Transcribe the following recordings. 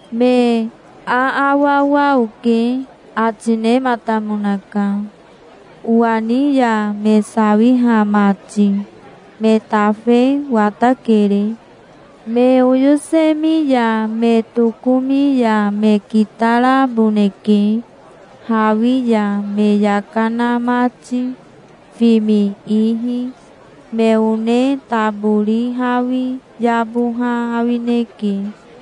"Me aawawa oke", ati nematamonaka, "owa ni ya me sawiha mati. Me tafe watakere. Me oyosemi ya me tokomi ya me kitaraboneke, hawi ya me yaka na mati, fimi ihi. Me one tabori hawi yaboha awineke".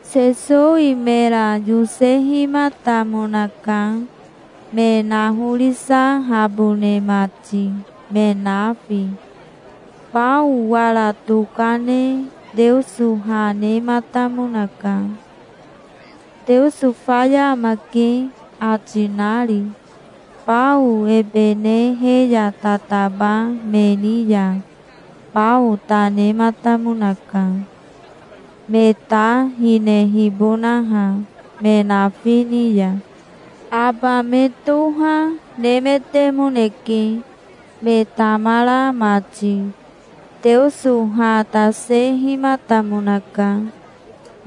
Sesowi mera yosehimatamonaka, me nahorisahabone mati, me nafi. Bao wara tokane Teoso ha nematamonaka, "Teoso faya amake", ati nari. Bao ebe ne he ya tataba me ni ya bao ta nematamonaka, me ta hinehibonaha, me nafi ni ya. Aba me toha, nemetemoneke, me tamara mati. Teoso ha tasehimatamonaka.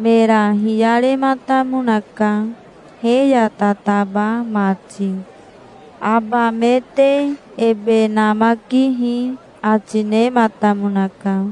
Mera hiyarematamonaka, he ya tataba mati. "Aba me te ebe namakihi", ati nematamonaka.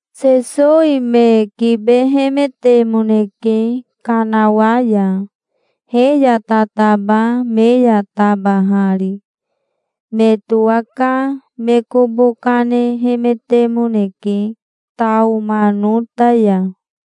Sesowi me kibehemetemoneke kanawa ya, he ya tataba me ya tabahari. Me towaka me kobo kanehemetemoneke, Taomanota ya.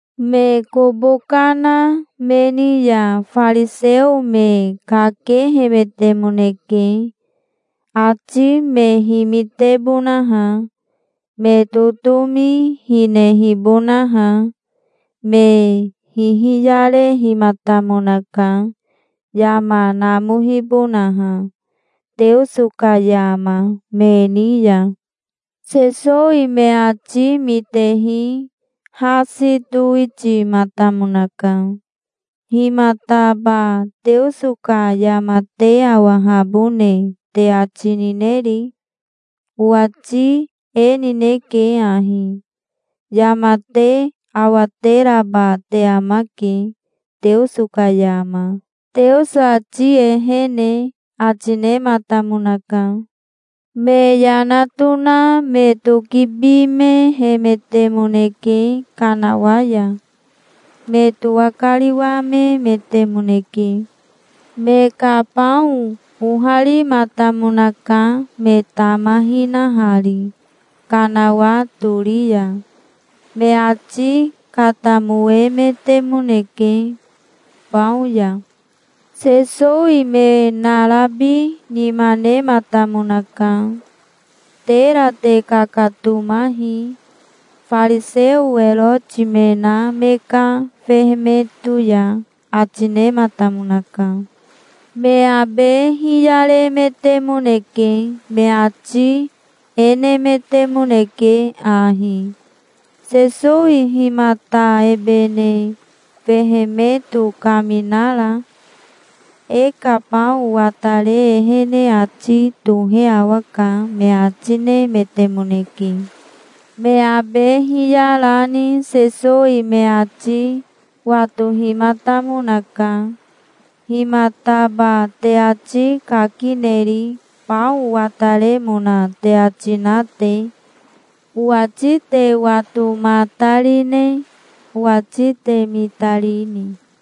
Me kobo kana me ni ya fariseo me kakehemetemoneke, ati me himitebonaha, me totomi hinehibonaha. Me hihiyarehimatamonaka, yama namohibonaha, Teoso ka yama, me ni ya. Sesowi me ati mitehi hasi towitimatamonaka. "Himataba Teoso ka yama te awahabone te ati nineri? Owati e nineke ahi: Yama te awateraba te amake, Teoso ka yama, Teoso ati ehene", ati nematamonaka. Me yana tona me tokibimehemetemoneke kanawa ya. Me towakariwamemetemoneke. Me ka bao oharimatamonaka, me tama hinahari, kanawa tori ya. Me ati katamoemetemoneke, bao ya. Sesowi me narabi nima nematamonaka. "Tera te kakatomahi, fariseo Eroti me na me ka fehemeto ya", ati nematamonaka. Me abe hiyaremetemoneke. Me ati e nemetemoneke ahi: "Sesowi himata ebe ne fehemeto kaminara? E ka bao watare ehene ati tohe awaka", me ati nemetemoneke. Me abe hiyarani Sesowi me ati watohimatamonaka. "Himataba te ati kakineri, bao wataremona te ati na te? Owati te watomatarine? Owati te mitarini?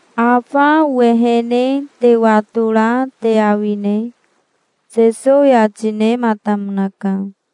"Afa owehene te watora te awine?" Sesowi ati nematamonaka.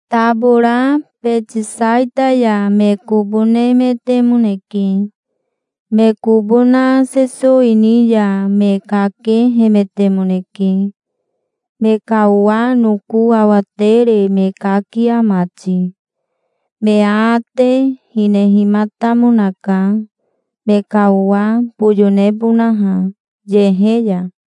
Tabora Betisaita ya me kobo nemetemoneke. Me kobo na Sesowi ni ya me kakehemetemoneke, me ka owa noko awatere me kakia mati. Me aate hinehimatamonaka, me ka owa boyo nebonaha, yehe ya.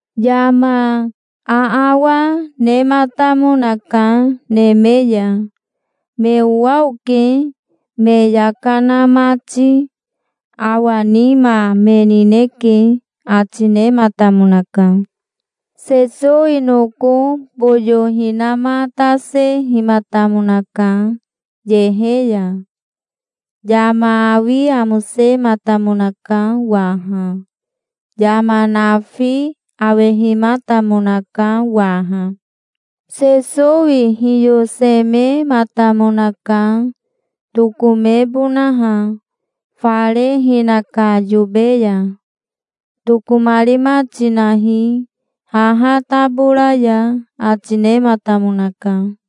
Yama aawa nematamonaka, neme ya. "Me owa oke, me yaka na mati. Awa nima me nineke", ati nematamonaka. Sesowi noko boyo hinamatasehimatamonaka, yehe ya. Yama awi amosematamonaka waha. Yama nafi awehimatamonaka waha. Sesowi hiyosemematamonaka, tokomebonaha, fare hinaka yobe ya. "Tokomarima tinahi, haha tabora ya", ati nematamonaka.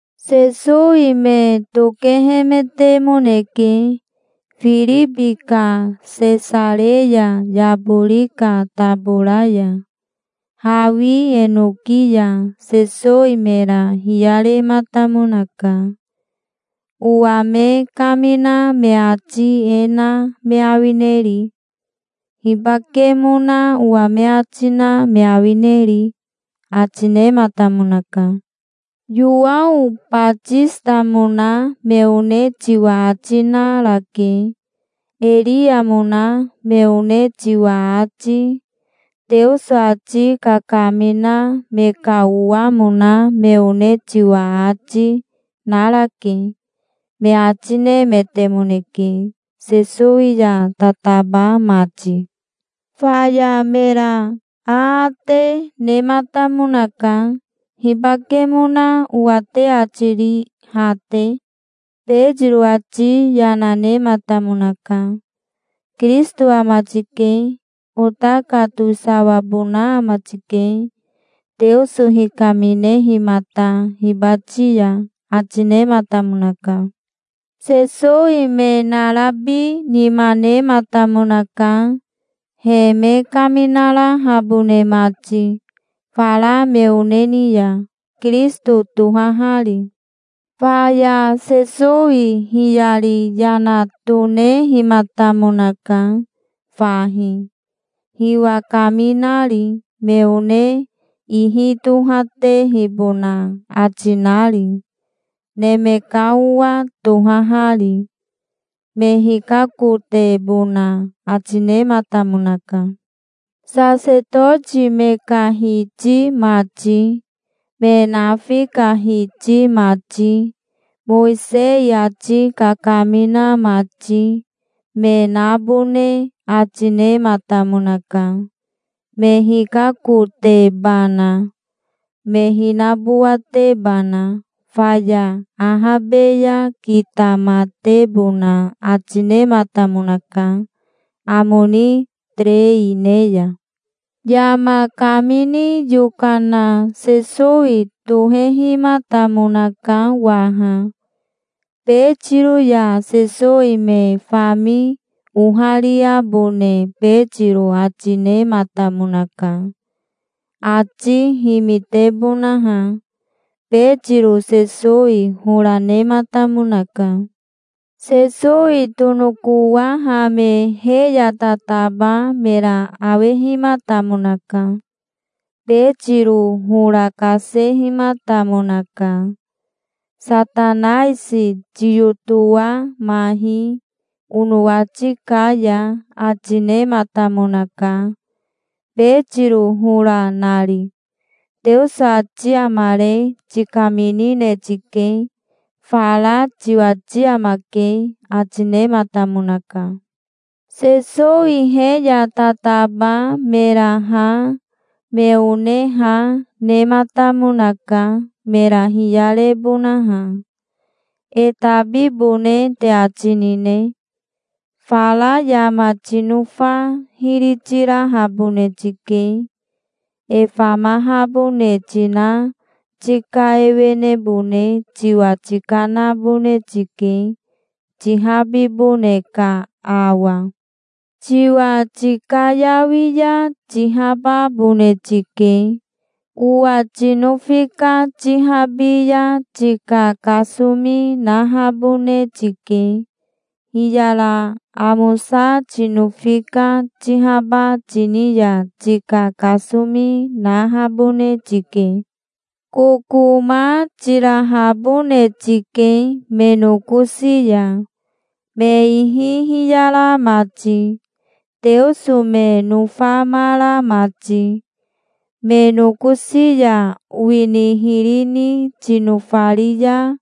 Sesowi me tokehemetemoneke, Firibi ka Sesareya yabori ka tabora ya. Hawi enoki ya Sesowi mera hiyarematamonaka. "Owa me kamina me ati e na me awineri? Hibakemona owa me ati na me awineri?" ati nematamonaka. "Yowao Batisitamona me one tiwa ati narake. Eriamona me one tiwa ati, Teoso ati kakamina me ka owamona me one tiwa ati, narake", me ati nemetemoneke, Sesowi ya tataba mati. Faya mera aate nematamonaka. "Hibakemona owa te ati ri, ha te?" Betiro ati yana nematamonaka. "Kirisito ama tike. Ota ka towisawabona ama tike, Teoso hikaminehimata hibati ya", ati nematamonaka. Sesowi me narabi nima nematamonaka, he me kaminarahabone mati, fara me one ni ya, Kirisito tohahari. Faya Sesowi hiyari yana tonehimatamonaka fahi, hiwa kaminari, me one ihi tohatehibona ati nari, Neme ka Owa tohahari. Me hikakotebona ati nematamonaka. Sasetoti me ka hiti mati, me nafi ka hiti mati, Mowisei ati kakamina mati, me nabone ati nematamonaka, me hikakotebana, me hinabowatebana. Faya ahabe ya kitamatebona ati nematamonaka, amo ni terei ne ya. Yama kamini yokana Sesowi tohehimatamonaka waha. Betiro ya Sesowi me fami ohariabone Betiro ati nematamonaka, ati himitebonaha. Betiro Sesowi hora nematamonaka. Sesowi tonokowahame he ya tataba mera awehimatamonaka. Betiro hora kasehimatamonaka. "Satanaisi tiyotowamahi onowati ka ya", ati nematamonaka, Betiro hora nari. "Teoso ati amare tikaminine tike. Fara tiwati amake", ati nematamonaka. Sesowi he ya tataba mera ha, me one ha, nematamonaka, mera hiyarebonaha. "E tabibone te ati nine? Fara yama tinofa hiri tirahabone tike. E famahabone tina tika ewenebone tiwa tikanabone tike, tihabibone ka awa. Tiwa tikayawi ya tihababone tike. Owa tinofi ka tihabi ya tika kasomi nahabone tike. Hiyara amosa tinofi ka tihaba tini ya tika kasomi nahabone tike. Kokoma tirahabone tike me nokosi ya, me ihi hiyara mati, Teoso me nofamara mati. Me nokosi ya owini hiri ni tinofari ya,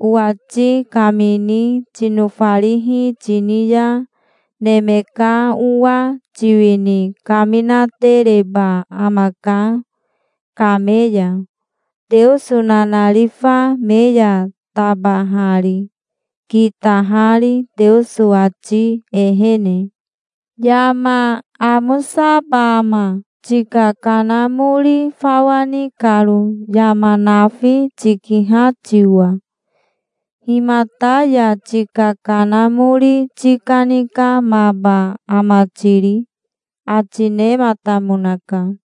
owati kamini tinofarihi tini ya Neme ka Owa tiwini kaminatereba amaka kame ya, Teoso nanarifa me ya tabahari, kitahari Teoso ati ehene. Yama amosaba ama, tika kanamori fawa ni karo, yama nafi tikiha tiwa? Himata ya tika kanamori tikanikamaba ama tiri?" ati nematamonaka.